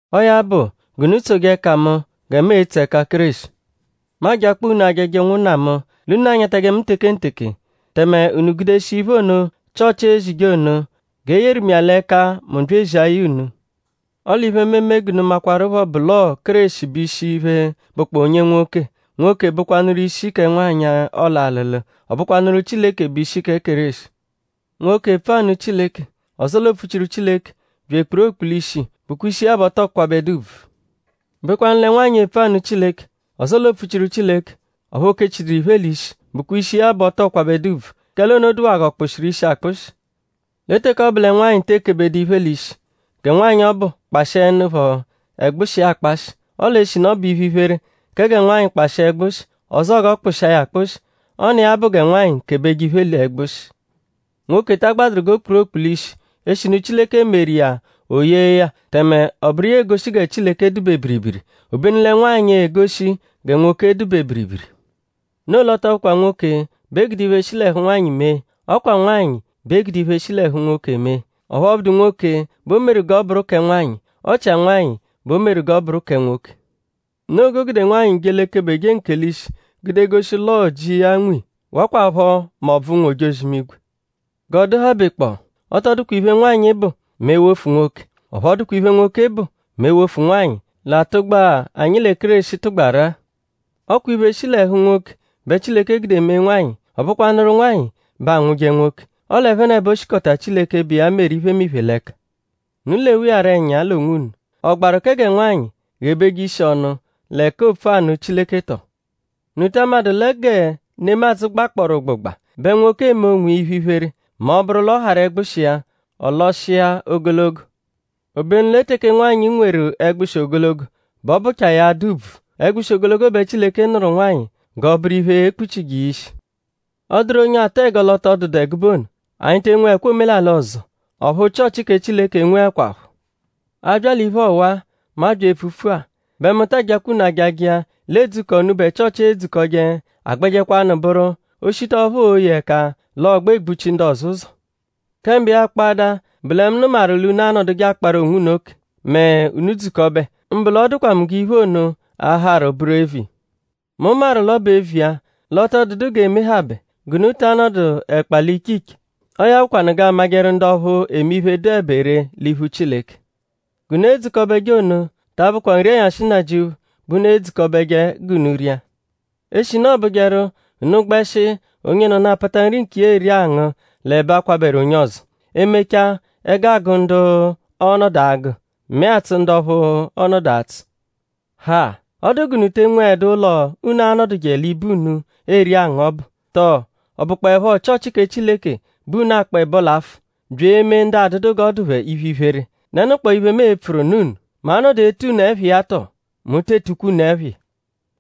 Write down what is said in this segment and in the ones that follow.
Ọo ya bụ; g'unu tsoje ẹka mu gẹ mu etso ẹka Kéreshi. Mu ajakpọo unu ajaja ụnwunna mu; l'unu anyatajẹ mu tekenteke; tẹme unu gudeshia iphe ono, Chịochi ezije ono; g'e yeru mu iya l'ẹka mu bya ezia ya unu. Ọle iphe, mu eme g'unu makwaruphọ bụ l'ọo Kéreshi bụ ishi iphe, bụkpoo onye nwoke; nwoke bụkwanuru ishi kẹ nwanyị, ọolu alụlu. Ọ bụkwanuru Chileke bụ ishi kẹ Kéreshi. Nwoke, epfu anụ Chileke; ọzoo l'oopfuchiru Chileke; bya ekpuru okpulishi; bụkwa ishi iya bẹ ọ tọo kwabẹdu ùbvù. O bekwanụ lẹ nwanyị, epfu anụ Chileke; ọzoo l'oopfuchiru Chileke; ọphu o kechiduru iphe l'ishi; bụkwa ishi iya bẹ ọ tọo kwabẹdu ùbvù; kẹle ono dụwaa g'ọ kpụshiru ishi akpụshi. Lẹ teke ọ bụ lẹ nwanyị tee kebedu iphe l'ishi; gẹ nwanyị ọbu kpashiẹnupho ẹgbushi iya akpashị. Ọle eshinu ọ bụ iphe-iphere kẹ gẹ nwanyị kpashịa ẹgbushi; ọzoo g'ọ kpụshia ya akpụshi; ọ n'iya bụ gẹ nwanyị kebeje iphe l'ẹgbushi. Nwoke ta agbadụru g'o kpuru okpulishi eshinu Chileke meru iya o yee ya tẹme ọ bụru iya egoshi gẹ Chileke dụ-be biribiri; obenu lẹ nwanyị egoshi gẹ nwoke dụ-be biribiri. Noo l'ọ tọ bụkwa nwoke bẹ e gude iphe, shi l'ẹhu nwanyị mee; ọ kwa nwanyị bẹ e gude iphe, shi l'ẹhu nwoke mee. Ọphu ọ bụdu nwoke bẹ o meru g'ọ bụru kẹ nwanyị; ọ chia nwanyị bẹ o meru g'ọ bụru kẹ nwoke. Noo g'o gude nwanyị je l'ekebeje nkelishi gude goshi l'ọo ji iya nwe iya; wakwaphọ m'ọbvu ụnwu-ojozi-imigwe. G'ọ dụhabekpoo; ọ tọ dụkwa iphe, nwanyị bụ mẹ e -wofu nwoke; ọphu ọ dụkwa iphe, nwoke bụ mẹ e -wofu nwanyị l'atụgba-a, anyi lẹ Kéreshi tụgbaru-a. Ọ kwa iphe, shi l'ẹhu nwoke bẹ Chileke gude mee nwanyị; ọ bụkwanuru nwanyị bẹ anwụje nwoke. Ọle ẹphenebo shikọta Chileke, bụ iya meru iphemiphe l'ẹka. Unu lewa iya rọ ẹnya l'onwunu.?Ọ gbaru kẹ gẹ nwanyị ghebeje ishi ọnu l'ẹka oopfu anụ Chileke tọo? ?Unu ta amadụ lẹ gẹ nemadzụ gbakpọoru ụgbugba bẹ nwoke eme onwiya iphe-iphere mẹ ọ -bụru l'ọ harụ ẹgbushi iya; ọ lọshia ogologo? Obenu lẹ teke nwanyị nweru ẹgbushi ogologo bẹ ọ bụchaa ya adụ ùbvù. Ẹgbushi ogologo bẹ Chileke nụru nwanyị g'ọ bụru iphe, e-kpuchije iya ishi. Ọ -dụru onye atụ ẹgo l'ọ tọ dụdu ẹgube ono; anyi te nweẹkwa omelalị ọzo; ọphu Chịochi kẹ Chileke enweẹkwapho. A bya l'iphe ọwa-a, mu abya epfupfu-a; bẹ mu ta ajakwa unu ajaja iya l'edzukọ, unubẹ Chịochi edzukọje agbẹjekwanu bụru; o -shita ọphu ooye ẹka l'ọogbe egbuchi ndu ọzo ụzo. Kẹ mbụ iya kpọada; bụ lẹ mu nụmaru l'unu anọduje akparu onwunu oke mẹ unu -dzukọbe; mbụ l'ọ dụkwa mu g'iphe ono a-harụ bụru eviya. Mu maru l'ọ bụ eviya l'ọ tọ dụdu g'eemehabẹ g'unu ta anọdu ẹkpa l'iche iche. Ọo ya bụkwanu g'aa-majẹru ndu ọphu eme iphe, dụebe ree l'iphu Chileke. G'unu edzukọbeje ono; ta abụkwa nri-ẹnyashi Nnajịuphu bẹ unu edzukọbeje g'unu ria; eshinu ọobujeru; unu gbẹshi onyenọnu apata nri nkiya eri angụ l'ẹbe akwabẹru onye ọzo. E -mechaa; ẹgu agụ ndu ọo-nọdu agụ; mẹe atsụ ndu ọphu ọo-nọdu atsụ. Ha!?Ọ dụ g'unu te enweẹdu ụlo, unu a-nọduje l'ibe unu eri angụ ọbu? Tọo;?ọ bụkpoepho Chịochi kẹ Chileke bẹ unu akpọ ẹbo l'afụ; bya eme ndu adụdu g'ọ dụ phẹ iphe-iphere??Dẹnukpoo iphe, mu e-pfuru nụ unu??Mu a-nọdu etu unu ẹpha iya tọ? Mu tee tukwa unu ẹpha iya!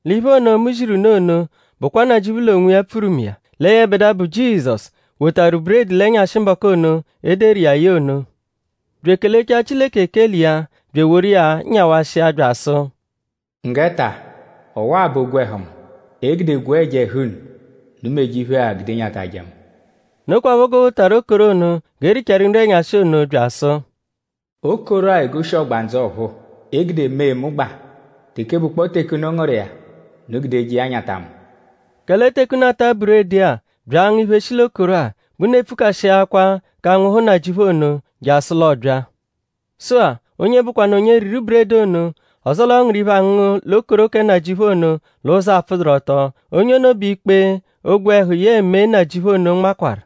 L'iphe ono, mu ziru unu ono bụkwa Nnajịuphu l'onwiya pfuru mu iya; lẹ yẹbedua, bụ Jizọsu wotaru buredi l'ẹnyashi mbọku ono, e deru iya ye ono; bya ekelechaa Chileke ekele iya bya eworu iya nyawashia bya asụ: “Nggẹ ta! Ọwa-a bụ ogwẹhu mu, e gude gwee ẹja ẹhu unu. Unu meje iphe-a gude nyatajẹ mu.” Nokwaphọ g'o wotaru okoro ono g'e richaaru nri-ẹnyashi ono bya asụ: “Okoro-a egoshi ọgbandzu ọ̀phúú, e gude mee mu gbaa. Teke bụkpoo teke unu ngụru iya; unu gudeje iya nyata mu.” Kẹle teke unu ata buredi-a; bya angụ iphe, shi l'okoro-a; bẹ unu epfukashiakwaa k'anwụhu Nnajịuphu ono; jasụ l'ọ bya. Sụ-a; onye bụkwanu onye riru buredi ono; ọzoo l'ọ ngụru iphe, angụngu l'okoro kẹ Nnajịuphu ono l'ụzo apfụduru-ọto; onye ono bẹ ikpe ogwẹhu yẹe mee Nnajịuphu ono nmakwaru.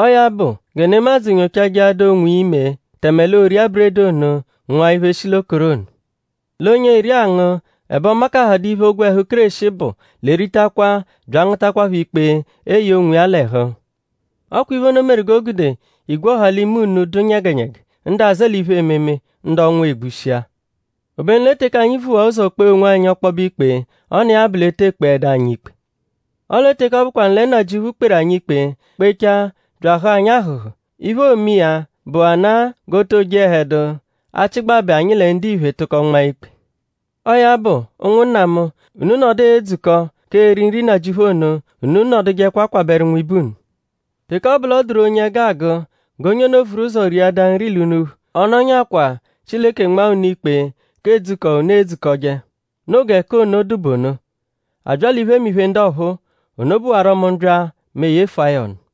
Ọo ya bụ gẹ nemadzụ nyochajẹadaa onwiya ime tẹme l'o ria buredi ono ngụa iphe, shi l'okoro ono. L'onye eri angụ; ẹbe ọ makahadụ iphe, ogwẹhu Kéreshi bụ; l'eritakwa bya angụtakwapho ikpe eye onwiya l'ẹhu. Ọ kwa iphe ono meru g'o gude igwe ọha l'ime unu dụ nyẹgenyege; ndu azẹe l'iphe-ememe; ndu ọnwu egbushia. Obenu lẹ teke anyi vuwaa ụzo kpee onwanyi ọkpobe ikpe; ọ n'iya bụ l'e tee kpeẹdu anyi ikpe. Ọle teke ọ bụkwanu lẹ Nnajịuphu kperu anyi ikpe; kpechaa bya ahụ̀a anyi ahụ̀hù; iphe, oome iya bụana g'oo too jehẹdu achịgbabe anyi lẹ ndiphe tụko nmaa ikpe. Ọo ya bụ; ụnwunna mu; unu -nọdu edzukọ k'eri nri Nnajịuphu ono; unu nọdujekwa kwabẹru nwibe unu. Teke ọ bụ l'ọ dụru onye ẹgu agụ; g'onye ono vuru ụzo riadaa nri l'unuphu; ọ nọnyakwaa Chileke nmaa unu ikpe k'edzukọ, unu edzukọje. Noo gẹ k'ono dụ bụ ono. A bya l'iphemiphe ndu ọphuu; ono bụwaro mu -bya; mu eyefua ya ọnu.